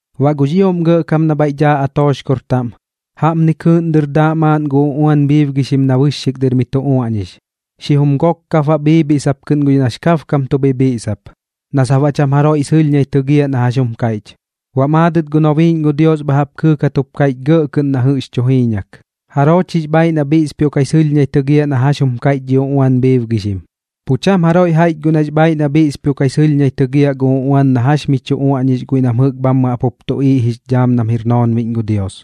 Baꞌ gux ioꞌm Gɇꞌkam na bhaiꞌ daa atooxkor taꞌm, jaꞌpni kɨɨꞌn dɨr daaꞌ maaꞌn gu uꞌuan bhiibgixim na bɨxxik dɨr mi tu uaꞌñix, xijum gok kap baꞌ bhiibhiꞌsap kɨꞌn guiꞌ nax kabkam tu bhibhiꞌsap, na sap baꞌ cham jaroiꞌ sɨlhñai tɨgiaꞌ na jax jum kaiꞌch. Baꞌ maadɨt gu nobiiꞌñ gu Dios bha jaꞌp kɨɨkat jup kaiꞌch gɇꞌ kɨꞌn na jɨꞌx tu jiiñak: ―¿Jaroo chix bhaiꞌ na bhiꞌspioꞌkai sɨlhñai tɨgiaꞌ na jax jum kaiꞌch dhi uꞌuan bhiibgixim? Pu cham jaroiꞌ jaiꞌch guꞌ nax bhaiꞌ na bhiꞌspioꞌkai sɨlhñai tɨgiaꞌ gu uꞌuan na jax mi tu uaꞌñix guiꞌ nam jɨꞌk bhammɨ jaꞌp jup tuꞌiiꞌ jix dhaam nam jir noonbiꞌñ gu Dios,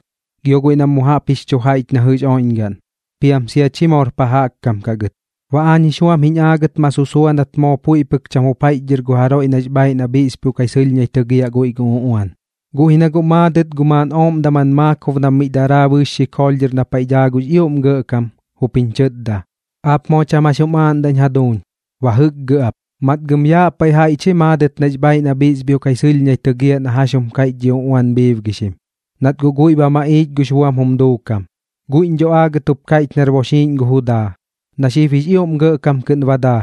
gio guiꞌ na mu jaꞌp jix chu jaiꞌch na jɨꞌx oiꞌñgaꞌn, piam sia chi moor pa jaꞌk kam kaꞌ gɨt. Baꞌ aañ jix buam jiñ aagɨt ma susua nat moo puiꞌ pɨk cham jup jaiꞌchdhɨr gu jaroiꞌ nax bhaiꞌ na bhiꞌspioꞌkai sɨlhñai tɨgiaꞌ guiꞌ gu uꞌuan. Guꞌ ji na guꞌ maadɨt gu maaꞌn ooꞌm daman maakob nam miꞌ daraa bɨɨx xikoolh dhɨr na paiꞌ daa gux ioꞌm Gɇꞌkam, jup jiñ chɨtda: ―Aap moo cham jax jum aaꞌndaꞌñ jaduuñ, ba jɨkgɨ ap. Matgam yaꞌ paiꞌ jaiꞌch ji maadɨt nax bhaiꞌ na bhiꞌspioꞌkai sɨlhñai tɨgiaꞌ na jax jum kaiꞌch dhi uꞌuan bhiibgixim, nat guꞌ guiꞌ ba maꞌiich gux buam jum duukam. Guiꞌñ dho aagɨt jup kaiꞌch nar boxiiꞌñ gu Judaa, na xib jix ioꞌm gɇꞌkam kɨꞌn ba daa,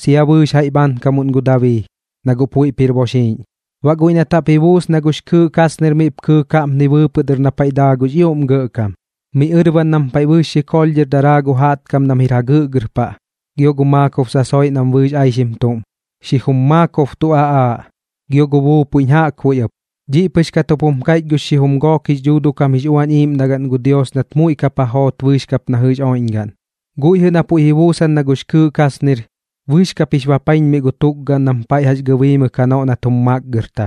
sia bɨɨx jaiꞌ bhaankamuꞌn gu Dabii, na guꞌ puiꞌp jir boxiiꞌñ. Baꞌ guiꞌ nat jaꞌp ji buus na gux kɨɨꞌ kasnir miꞌp kɨɨk jaꞌpni bɨɨpɨꞌ dɨr na paiꞌ daa gux ioꞌm Gɇꞌkam, miꞌ ɨrban nam paiꞌ bɨɨx xikoolh dhɨr daraa gu jaꞌtkam nam jir jagɨꞌgɨr paꞌ gio gu maakob sasoiꞌ nam bɨɨx aixim tuꞌm, xijum maakob tu aꞌaaꞌ, gio gu buupuiꞌñ jaꞌkbuiꞌ ɨp. Dhiꞌ pɨx kat jup jum kaiꞌch gux xijum gook jix dhuuduꞌ kam jix uꞌuañ iꞌiiꞌmdagaꞌn gu Dios nat muiꞌ kap ja joot bɨɨx kap na jɨꞌx oiꞌñgaꞌn. Guiꞌ jɨꞌ na puiꞌ ji buusan na gux kɨɨꞌ kasnir, bɨɨx kap jix bapaiñmiꞌ gu tukgaꞌn nam paiꞌ jax gɨbiimɨk janoꞌ nat jum makgɨrta,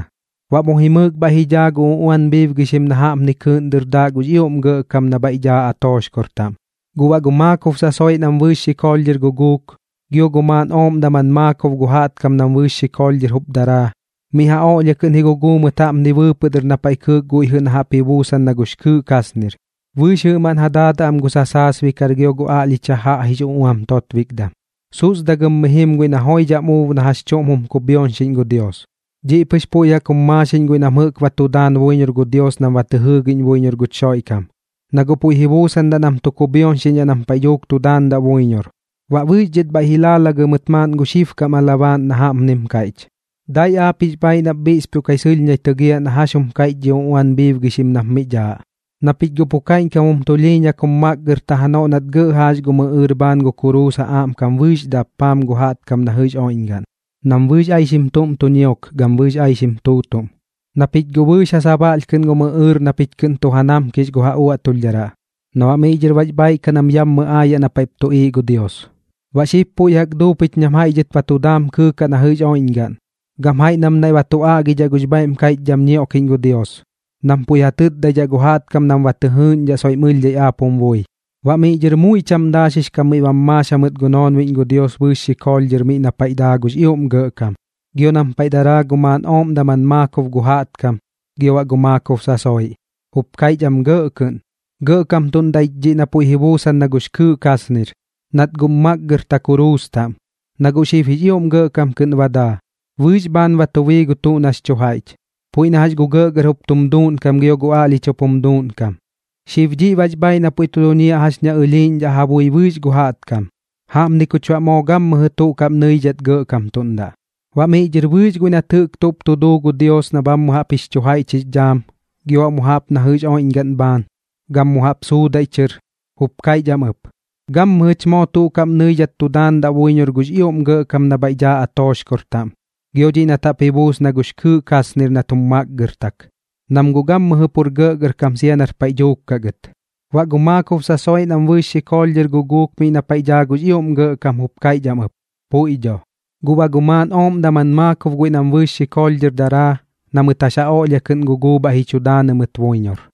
baꞌ mu jimɨɨk bhaiꞌ ji dhaa gu uꞌuan bhiibgixim na jaꞌpni kɨɨꞌn dɨr daaꞌ gux ioꞌm Gɇꞌkam na bhaiꞌ daa atooxkor taꞌm. Guꞌ baꞌ gu maakob sasoiꞌ nam bɨɨx xikoolh dhɨr guguuk, gio gu maaꞌn ooꞌm daman maakob gu jaꞌtkam nam bɨɨx xikoolh dhɨr jup daraa, miꞌ ja oꞌlhia kɨꞌn ji guguu mɨt jaꞌpni bɨɨpɨꞌ dɨr na paiꞌ kɨɨk guiꞌ jɨꞌ na jaꞌp ji buusan na gux kɨɨꞌ kasnir, bɨɨx jɨꞌmaꞌn ja daadaꞌ am gu sasaasbikar gio gu aꞌlhich jajaꞌ jix uꞌuam totbikdam, susdagɨm mi jim guiꞌ na joidham uub na jax chuꞌm jum kubhioñxiꞌñ gu Dios. Dhiꞌ pɨx puiꞌ jaꞌk jum maaxiꞌñ guiꞌ nam jɨꞌk ba tu daan buiñor gu Dios nam ba tɨ jɨɨgiꞌñ buiñor guch Xoiꞌkam, na guꞌ puiꞌ ji buusandaꞌ nam tu kubhioñxiꞌñdhaꞌ nam paiꞌ dhuuk tu daandaꞌ buiñor. Baꞌ bɨɨx dhɨt bhaiꞌ ji laalagɨ mɨt maaꞌn gu xibkam alabaaꞌn na jaꞌpnim kaiꞌch: Dai aap jix bhaiꞌ nap bhiꞌspioꞌkai sɨlhñai tɨgiaꞌ na jax jum kaiꞌch dhi uꞌuan bhiibgixim nap miꞌ daaꞌ, na pich guꞌ pu kaiꞌñkam jum tulhiiñaimɨk jum makgɨrta janoꞌ nat gɇꞌ jaax gum ɨꞌɨɨr bhaan gu kuruus ja aꞌmkam bɨɨx dappaam gu jaꞌtkam na jɨꞌx oiꞌñgaꞌn, nam bɨɨx aixim tuꞌm tu ñiok gam bɨɨx aixim tuutuꞌm, na pich guꞌ bɨɨx ja sabaꞌlh kɨꞌn gum ɨꞌɨɨr na pich kɨꞌn tu ja namkix gu ja uaꞌtulhdharaꞌ na baꞌ miꞌ dhɨr bax bhaiꞌ kaꞌ nam yammɨ aayaꞌ na paiꞌp tuꞌiiꞌ gu Dios. Baꞌ xib puiꞌ jaꞌk ba duu pich nam jaiꞌ dhɨt ba tu daam kɨɨkaꞌ na jɨꞌx oiꞌñgaꞌn, gam jaiꞌ nam naiꞌ ba tu aꞌgidhaꞌ gux bhaiꞌm kaiꞌchdham ñioꞌkiꞌñ gu Dios, nam puiꞌ ja tɨtdaidhaꞌ gu jaꞌtkam nam ba tɨ jɨɨꞌñdhaꞌ soiꞌm ɨlhdhai aap jum bui. Baꞌ miꞌ dhɨr muiꞌ cham daaxix kam miꞌ bam maax jamɨt gu noonbiꞌñ gu Dios bɨɨx xikoolh dhɨr miꞌ na paiꞌ daa gux ioꞌm Gɇꞌkam, gio nam paiꞌ daraa gu maaꞌn ooꞌm daman maakob gu jaꞌtkam gio baꞌ gu maakob sasoiꞌ. Jup kaiꞌch am gɇꞌ kɨꞌn: Gɇꞌkamtuꞌndaꞌ ich dhiꞌ na puiꞌ ji buusan na gux kɨɨꞌ kasnir, nat guꞌm makgɨrta kuruus taꞌm. Na guꞌ xib jix ioꞌm gɇꞌkam kɨꞌn ba daa, bɨɨx bhaan ba tu bii gu tuꞌ nax chu jaiꞌch, puiꞌ na jax gu gɇꞌgɇr jup tum duuꞌnkam gio gu aꞌlhich jup tum duuꞌnkam. Xib dhiꞌ bax bhaiꞌ na pu tu duñiaꞌ jax ña ɨlhiiꞌñdhaꞌ ja bui bɨɨx gu jaꞌtkam. Jaꞌpni kuch baꞌ moo gammɨjɨ tuꞌ kaꞌm nɨidhat gɇꞌkamtuꞌndaꞌ. Baꞌ miꞌ dhɨr bɨɨx guiꞌ nat jɨꞌk tuꞌp tu duu gu Dios na bhammɨ jaꞌp jix chu jaiꞌch jix dhaam, gio baꞌ mu jaꞌp na jɨꞌx oiꞌñgaꞌn bhaan, gam mu jaꞌp suudaiꞌ chɨr, jup kaiꞌch am ɨp: Gammɨjɨch moo tuꞌ kaꞌm nɨidhat tu daandaꞌ buiñor gux ioꞌm Gɇꞌkam na bhaiꞌ daa atooxkor taꞌm gio dhiꞌ nat jaꞌp ji buus na gux kɨɨꞌ kasnir nat jum makgɨrtak, nam guꞌ gammɨjɨ pur gɇꞌgɇrkam sia nar paiꞌ dhuuk kaꞌ gɨt. Baꞌ gu maakob sasoiꞌ nam bɨɨx xikoolh dhɨr guguuk miꞌ na paiꞌ daa gux ioꞌm Gɇꞌkam jup kaiꞌch am ɨp: ―Puiꞌ dho. Guꞌ baꞌ gu maaꞌn ooꞌm daman maakob guiꞌ nam bɨɨx xikoolh dhɨr daraa, na mɨt jax ja oꞌlhia kɨꞌn guguu bhaiꞌ ji chu daanɨ mɨt buiñor.